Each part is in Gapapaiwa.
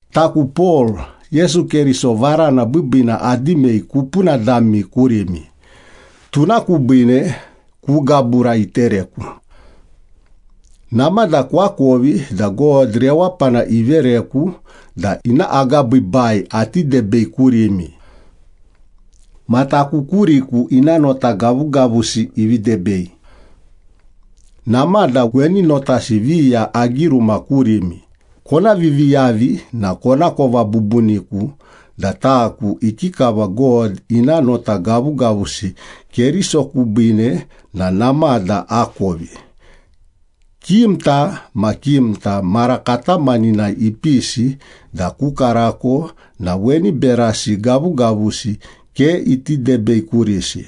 Taku Pol, Yesu Keriso varana biibiina adimei kupuna dami kurimi, tuna kubiine ku gabura itereku. Namada koakovi da God rewapana ivereku da ina agabiibai ati debei kurimi. Ma taku kuriku ina nota gavugavusi ivi debei. Namada weni notasi viya agiruma kurimi kona viviyavi na konakova bubuniku da taku ikikava God ina nota gavugavusi Keriso kubiine na namada akovi. Kimta ma kimta mara katamaninai ipisi da ku karako na weni berasi gavugavusi ke iti debei kurisi.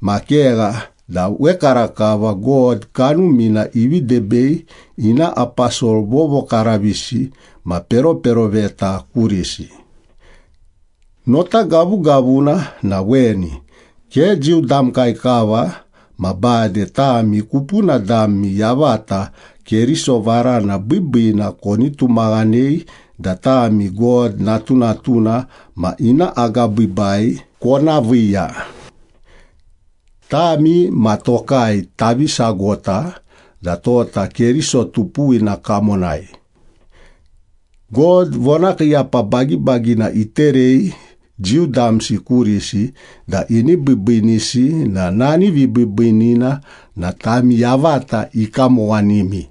Ma kegha da wekarakava God Kanumina ivi debei ina aposol vovokaravisi ma peroperoveta kurisi. Nota gavugavuna na weni, ke Jiu damkai kava ma bade tami kupuna dami yavata Keriso varana biibiina koni tumaghanei da tami God natunatuna ma ina agabiibai kona viiya. Tami ma tokai tavi sagota da tota Keriso tupuwina kamonai. God vonakiiyapa bagibagina iterei Jiu damsi kurisi da ini biibiinisi na nani vibiibiinina na tami yavata ikamowanimi.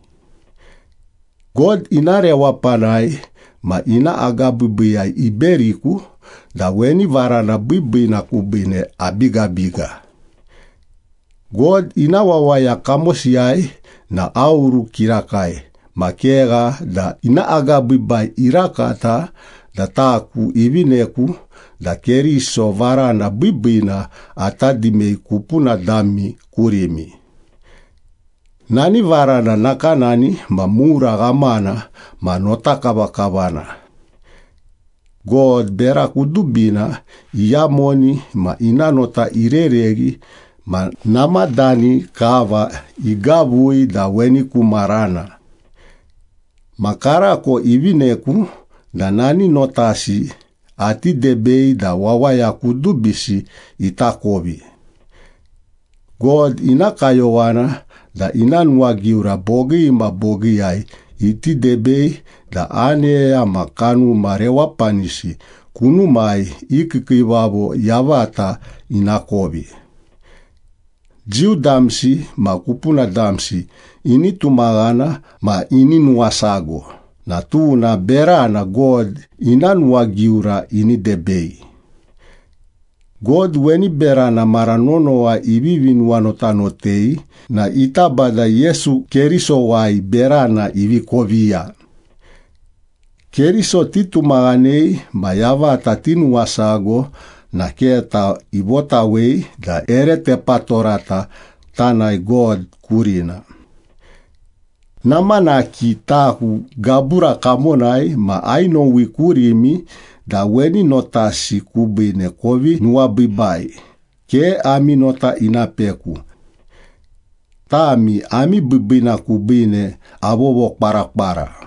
God ina rewapanai ma ina agabiibiiyai iberiku da weni varana biibiina kubiine abigabiga. God ina wawaya kamosiyai na aoru kirakai ma kegha da ina agabiibai irakata da taku ivineku da Keriso varana biibiina ata dimei kupuna dami kurimi. Nani varana nakanani ma mura ghamana ma notakavakavana. God bera kudubina iyamoni ma ina nota irereghi ma namadani kava igavui da weni ku marana. Ma karako ivineku da nani notasi ati debei da wawaya kudubisi itakovi. God ina kayowana da ina nuwagiura bogii ma bogiiyai iti debei da aneya ma kanuma rewapanisi kunumai i kiikiivavo yavata inakovi. Jiu damsi ma kupuna damsi ini tumaghana ma ini nuwasago na tuna berana God ina nuwagiura ini debei. God weni berana mara nonowa ivivi nuwanotanotei na ita Bada Yesu Kerisowai berana ivi koviya. Keriso titumaghanei ma yavata tinuwasago na keta ivotawei da ere tepatorata tanae God kurina. Namanaki taku gabura kamonai ma ainowi kurimi da weni notasi kubiine kovi nuwabiibai, ke ami nota ina peku. Tami ami biibiina kubiine avovokwarakwara.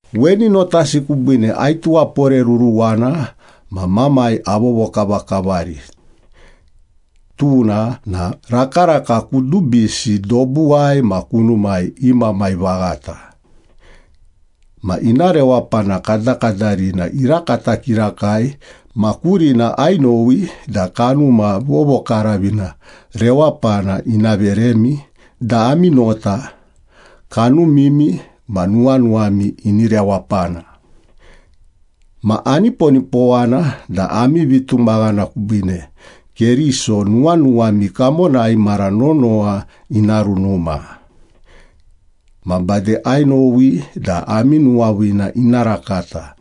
Weni notasi kubiine aituwaporeruruwana ma Mamai avovokavakavari. Tuna na rakaraka kudubisi dobuwai ma kunumai i Mamai vaghata. Ma ina rewapana kadakadarina irakata kirakai, ma kurina ainowi da Kanuma Vovokaravina rewapana ina veremi da ami nota, kanumimi, ma nuwanuwami ini rewapana. Ma aniponipowana da ami vitumaghana kubiine Keriso nuwanuwami kamonai mara nonowa ina runuma. Ma bade ainowi da ami nuwaviina ina rakata.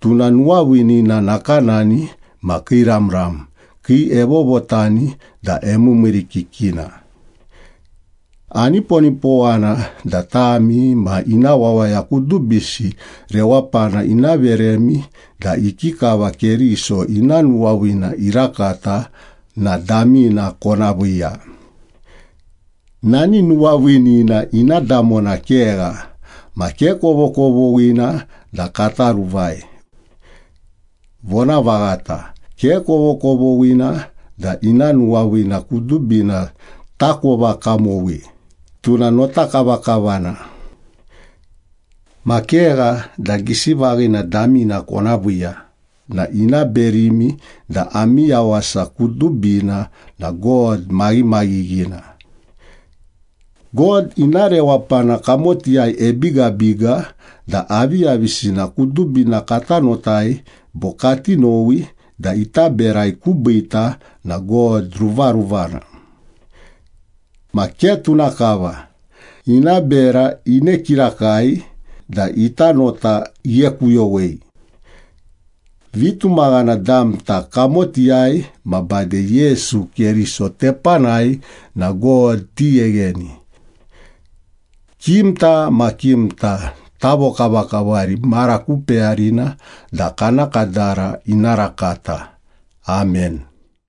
Tuna nuwaviinina nakanani ma kiiramram, kii evovotani da emiimiirikikina. Aniponipowana da tami ma ina wawaya kudubisi rewapana ina veremi da ikikava Keriso ina nuwaviina irakata na damina kona viiya. Nani nuwaviinina ina damona kegha ma ke kovokovoghina da kata ruvai. Vonavaghata, ke kovokovoghina da ina nuwaviina kudubina takova kamowi, tuna notakavakavana. Ma kegha da gisi vaghina damina kona viiya na ina berimi da ami yawasa kudubina na God maghimaghighina. God ina rewapana kamotiyai ebigabiga da aviyavisina kudubina kata notai bo kati nowi da ita berai kubiita na God ruvaruvana. Ma ke tuna kava, ina bera ine kirakai da ita nota ighekuyowei. Vitumaghana damta kamotiyai ma bade Yesu Keriso tepanai na God tighegheni. Kimta ma kimta tavokavakavari mara ku peyarina da kana kadara ina rakata. Amen.